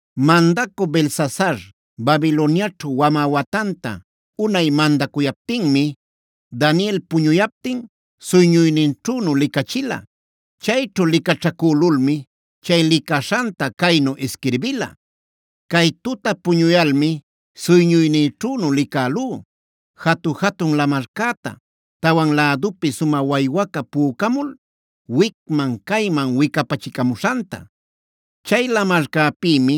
Mandacü Belsasar Babiloniaćhu wamä watanta unay mandacuyaptinmi, Daniel puñuyaptin suyñuyninćhünu licachila. Chayćhu licaćhacülulmi chay licaśhanta caynu isquirbila: “Cay tuta puñuyalmi suyñuynïćhünu licälú, jatu-jatun lamarcäta tawan lädupi sumä waywaca pücamul wicman-cayman wicapacachimuśhanta. Chay lamarcäpïmi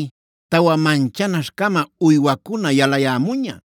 tawa manchanaśh-cama uywacuna yalayämuña.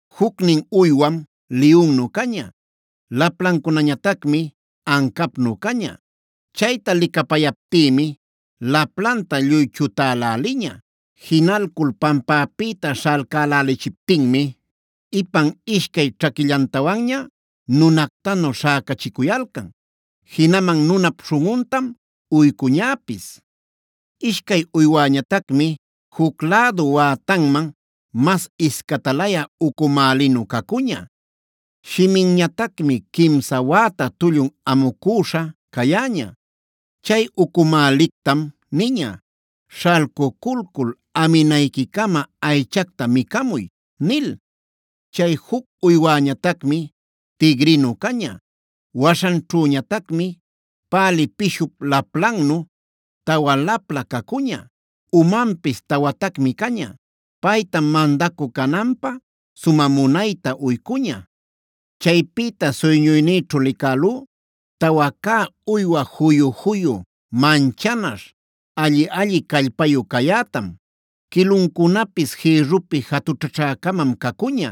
Jucnin uywam liyunnu caña; laplancunañatacmi ancapnu caña. Chayta licapayaptïmi laplanta lluy chutäläliña. Jinalcul pampäpïta śhalcälächiptinmi ipan ishcay ćhaquillantawanña nunactanu śhäcachicuyalcan. Jinaman nunap śhunꞌuntam uycuñäpis. “Ishcay uywäñatacmi juc lädu wätanman masta iscatalayä ucumälinu cacuña. Shiminñatacmi quimsa wäta tullun amucüśha cayäña. Chay ucumälictam niña: ‘Śhalcuculcul aminayquicama aychacta micamuy’ nil. “Chay juc uywäñatacmi tigrinu caña.b Waśhanćhüñatacmi pälï pishup laplannu tawa lapla cacuña. Umanpis tawatacmi caña. Paytam mandacü cananpä sumä munayta uycuña. “Chaypïta suyñuynïćhu licälú tawa cä uywa juyu-juyu, manchanaśh, alli-alli callpayu cayätam. Quiluncunapis jïrrupi jatućhaćha-camam cacuña.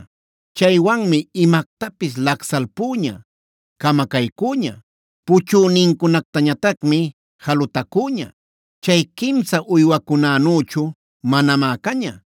Chaywanmi imactapis lacsalpüña camacaycüña. Puchünincunactañatacmi jalutacüña. Chay quimsa uywacunänüchu manamá caña.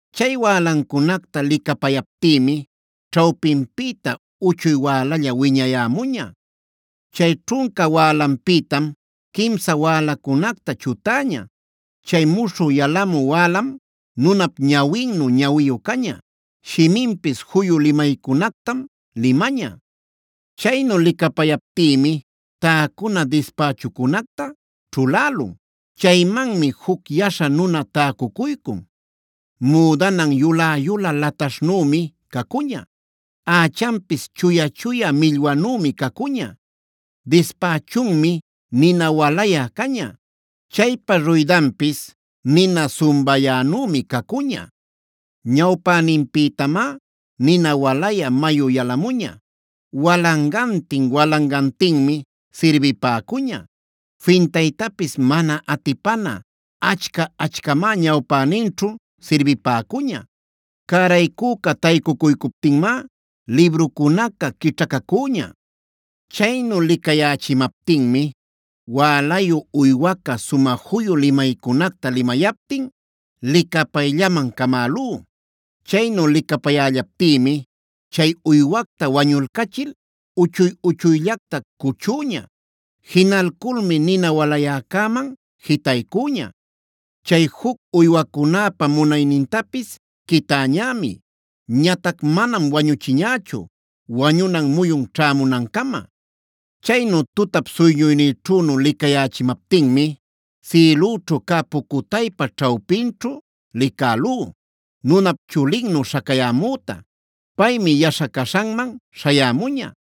Chay wälancunacta licapayaptïmi ćhawpinpïta uchuy wälalla wiñayämüña. Chay ćhunca wälanpïtam quimsa wälacunacta chutäña. Chay muśhü yalamü wälam nunap ñawinnu ñawiyu caña; shiminpis juyu limaycunactam limaña. “Chaynu licapayaptïmi täcuna dispächucunacta ćhulälun. Chaymanmi juc Yaśha nuna taycucuycun.d Müdanan yulä-yulä laśhtanümi cacuña.e Ächanpis chuya-chuya millwanümi cacuña. Dispächunmi nina walayä caña; chaypa ruydanpis nina sumbayänümi cacuña. Ñawpäninpïtamá nina walayä mayu yalamuña.f Walangantin-walangantinmi sirbipäcuña. Fintaytapis mana atipana achca-achcamá ñawpäninćhu sirbipäcuña. Cäraycüca taycucuycuptinmá librucunaca quićhacacüña. “Chaynu licayächimaptinmi wälayu uywaca sumä juyu limaycunacta limayaptin licapayllaman camälú. Chaynu licapayällaptïmi chay uywacta wañulcachil uchuy-uchuyllacta cuchüña. Jinalculmi nina walayäcäman jitaycüña. Chay juc uywacunäpa munaynintapis quitäñämi. Ñatac manam wañuchiñächu wañunan muyun ćhämunancama. “Chaynu tutap suyñuynïćhünu licayächimaptinmi sïlüćhu cä pucutaypa ćhawpinćhu licälú, nunap chulinnu śhacayämüta. Paymi yaśha caśhanman śhayämuña.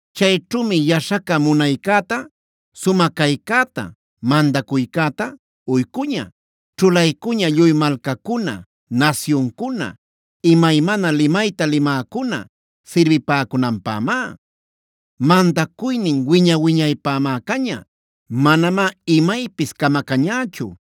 Chayćhümi yaśhaca munaycäta, sumä caycäta, mandacuycäta uycuña. Ćhulaycuña lluy malcacuna, nasyuncuna, imaymana limayta limäcuna sirbipäcunanpämá. Mandacuynin wiña-wiñaypämá caña: manamá imaypis camacañächu.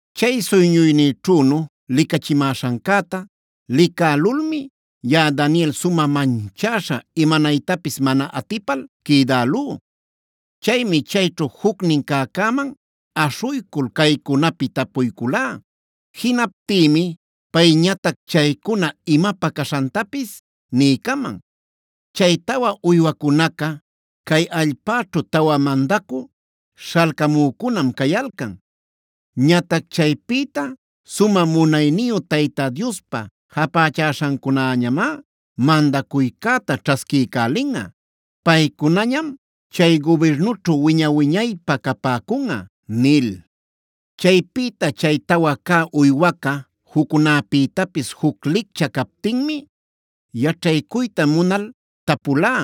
“Chay suyñuynïćhünu licachimäśhancäta licälulmi yaꞌa Daniel sumä manchäśha imanaytapis mana atipal quïdälú. Chaymi chayćhu jucnin cäcäman aśhuycul caycunapi tapuyculá. Jinaptïmi payñatac chaycuna imapä caśhantapis niycaman: ‘Chay tawa uywacunaca, cay allpäćhu tawa mandacü śhalcamücunam cayalcan. Ñatac chaypïta sumä munayniyu Tayta Diospa japächäśhancunäñamá mandacuycäta ćhasquiycälinꞌa. Paycunañam chay gubirnućhu wiña-wiñaypä capäcunꞌa’ nil. “Chaypïta chay tawa cä uywaca juccunäpïtapis juc licchä captinmi, yaćhaycuyta munal tapulá: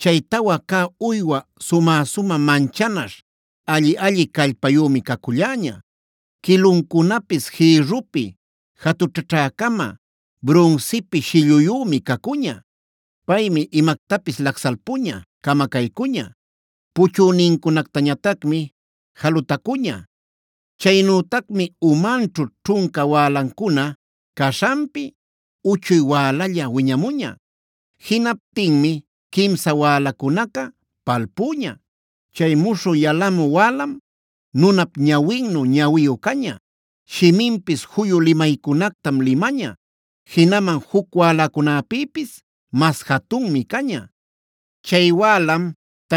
‘Chay tawa cä uywa sumä-sumä manchanaśh, alli-alli callpayümi caculläña. Quiluncunapis jïrrupi jatućhaćha-cama, brunsipi shilluyümi cacuña. Paymi imactapis lacsalpuña camacaycuña. Puchünincunactañatacmi jalutacuña. Chaynütacmi umanćhu ćhunca wälancuna caśhanpi, uchuy wälalla wiñamuña. Jinaptinmi quimsa wälacunaca palpüña. Chay muśhü yalamü wälam nunap ñawinnu ñawiyu caña; shiminpis juyu limaycunactam limaña. Jinaman juc wälacunäpïpis mas jatunmi caña. Chay wälam,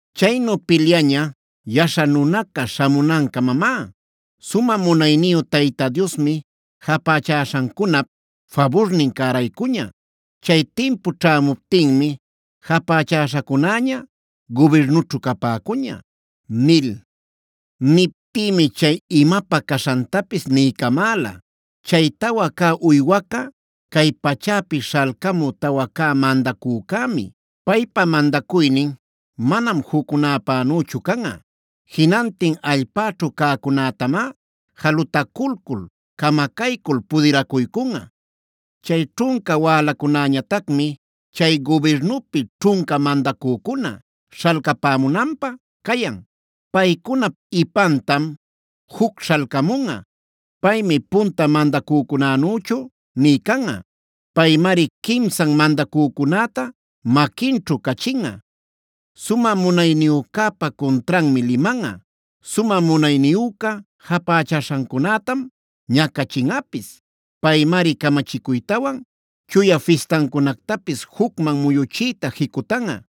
Chaynu pilyaña Yaśha nunaca śhamunancamamá. Sumä munayniyu Tayta Diosmi japächäśhancunap faburnin cäraycuña.j Chay timpu ćhämuptinmi japächäśhacunäña gubirnućhu capäcuña’ nil. “Niptïmi chay imapä caśhantapis niycamäla: ‘Chay tawa cä uywaca cay pachäpi śhalcamü tawa cä mandacücämi. Paypa mandacuynin manam juccunäpanüchu canꞌa. Jinantin allpäćhu cäcunätamá jalutaculcul, camacaycul pudiracuycunꞌa. “ ‘Chay ćhunca wälacunäñatacmi chay gubirnupi ćhunca mandacücuna śhalcapämunanpä cayan.k Paycunap ipantam juc śhalcamunꞌa. Paymi punta mandacücunänüchu nï canꞌa. Paymari quimsan mandacücunäta maquinćhu cachinꞌa. Sumä munayniyücäpa cuntranmi limanꞌa. Sumä munayniyüca japächaśhancunätam ñacachinꞌapis. Paymari camachicuytawan chuya fistancunactapis jucman muyuchiyta jicutanꞌa.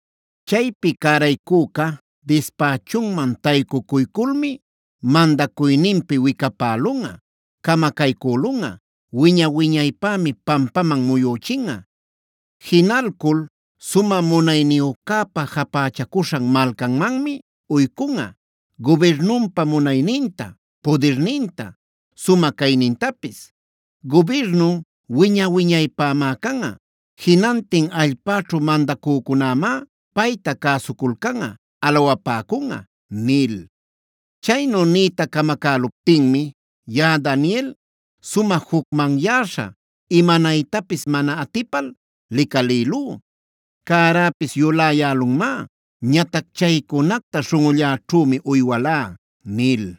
“ ‘Chaypi cäraycüca dispächunman taycuyculmi mandacuyninpi wicapälunꞌa, camacaycülunꞌa; wiña-wiñaypämi pampaman muyüchinꞌa. Jinalcul sumä munayniyücäpa japächacuśhan malcanmanmi uycunꞌa gubirnunpa munayninta, pudirninta, sumä caynintapis. Gubirnun wiña-wiñaypämá canꞌa. Jinantin allpäćhu mandacücunämá payta cäsuculcanꞌa, alawapäcunꞌa’ nil. “Chaynu niyta camacäluptinmi yaꞌa Daniel sumä jucmanyäśha imanaytapis mana atipal licalïlú. Cäräpis yuläyälunmá. Ñatac chaycunacta śhunꞌulläćhümi uywalá” nil.